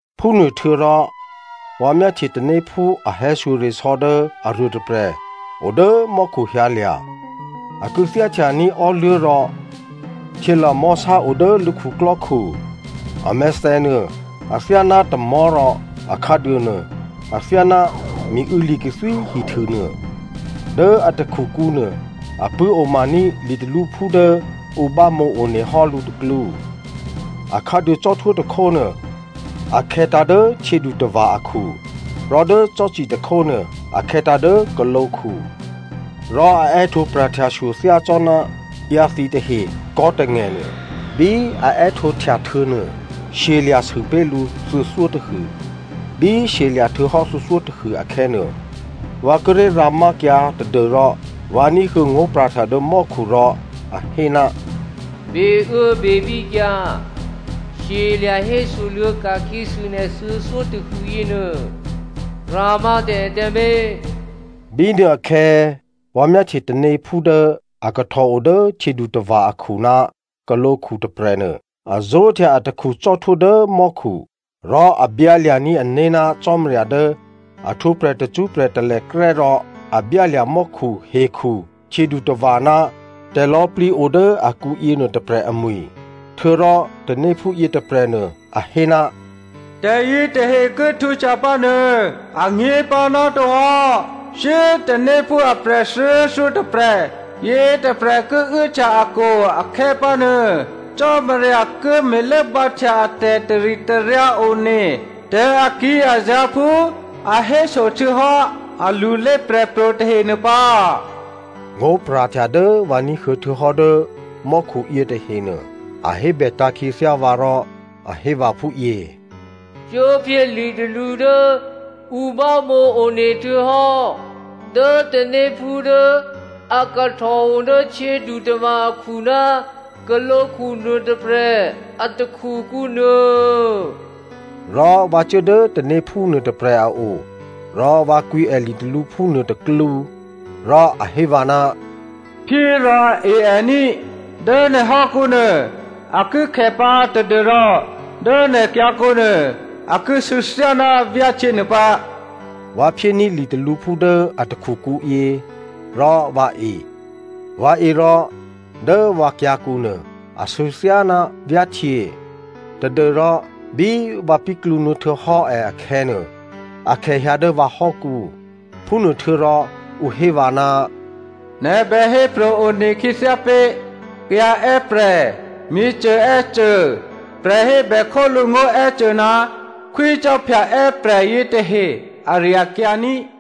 Phúnuôhtuô̌rò vǎ myáhtye tanéphú a hè̌shyoresò̌ dố aruô tôprè̤ odố mò́khu hyǎlya̤. A kû̌thyá htyaní̤ ò́luố̤ rò htyělamò̤́sá o dố lǔ khuklò́khu. A mèthènuô athyáná tamò̤́ rò a khǎduônuô athyáná miû̌ li̤kathwí hihtû nuô. Dố a takhukǔ nuô, a pṳ̂́omaní̤ litalǔphú dố ǔ bámǒ one hò́ lǔ tôklǔ. Akhǎduô cò́htwó tôkhónuô a khè̌tǎ̤ dố htyědutava̤ akhu, rò dố cò́ci tôkhónuô a khè̌tǎ̤ dố khǒlǒkhu. Rò a è́htǒ pra̤htyashyo thyácò́ná ǎyǎthǐ tahe kò̤́tangè̤ nuô. Bí a è́htǒhtya htuô̌nuô, shyelya̤ sûpé̤ lǔ thuô̌thyótôhû. Bí shyelya̤ htuô̌ thuô̌thyótôhû akhè̌nuô, vǎ kíré̤ rǎmákyǎ tadû́rò vǎ ní̤huô̌ ngó̤pra̤htya dố mò́khu rò a hé, “Beuốbebíkyǎ shyelya̤ hésoluô̌ ka̤khyěsû nè̤ thuô̌thyó tôhû yěnuô. Rǎmá tǎ è tǎmé̤.” Bínuôakhè̌ vǎ myáhtye tanéphú dố a kahtòo dố htyědutava̤ akhu ná khǒlǒkhu tôprè̤nuô a zó̤htya atakhu cò́htwó dố mò́khu. Rò a byǎlya̤ní̤ ané̤ ná Cò́marya dố a htwǒprè̤ tacṳ́prè̤ talèkrè́ rò a byálya̤ mò́khu, hekhu, htyědutava̤ ná tè̤lò̌꤮ plǐ o dố akǔ yěnuô tôprè̤ amwi̤. Htuô̌rò tanéphú yětôprè̤nuô a hé, “Tè̤yětahe ki htwǒhtya pǎ nuô anyě̤pǎ nátohò́. Shyé꤮ tanéphú aprè̤ thuô̌thyótôprè̤ yětôprè̤ ki uốhtya akwo̤ akhè̌pǎnuô, Cò́marya ki me̤lốbǎhtya atè̤ taritaryǎ one tè̤acò́azǎ̤ phú a héso htuô̌hò́ alulé prè̤pro̤ tahe nuô pǎ.” Ngó̤pra̤htya dố vǎ ní̤huô̌ htuô̌hò́ dố mò́khu yětahenuô, a hébètǎ̤ khyěthyá vǎ rò a hé vǎ phúyě, “Cuốphyé litalǔ dố ǔ bámǒ one htuô̌hò́ dố tanéphú dố a kahtòo dố htyědutava̤ akhu ná khǒlǒkhu nuôtôprè̤ a takhukǔ nuô.” Rò vǎ cuố dố tanéphú nuôtôprè̤ a o rò vǎ kwǐ è litalǔphú nuôtôklǔ. Rò a hé vǎ, “Phyé rò e è ní꤮. Dố nè̤ hò́kǔnuô a ki khè pǎ tadû́rò dố nè̤ kyǎ̤kǔnuô a ki sû̌ thyáná vyáhtyě nuô pǎ.” Vǎ phyéní̤ litalǔphú dố a takhukǔ yě rò vǎ e. Vǎ e rò dố vǎ kyǎ̤kǔ nuô, asû̌ thyáná vyáhtyě tadû́rò bí vǎ píklǔnuô̌ htuô̌hò́ è akhè̌ nuô, akhè hyǎ dố vǎhò́kǔ. Phúnuôhtuô̌rò ǔ hé vǎ, “Nè̤ bè hépro̤ one khyěthyá pé̤ kayǎ è́prè̤, myěcô è́cô, prè̤hébè khólǔ ngó̤ è́cô ná khwícò́phya è́prè̤ yětahe ari-akyǎ ní꤮.”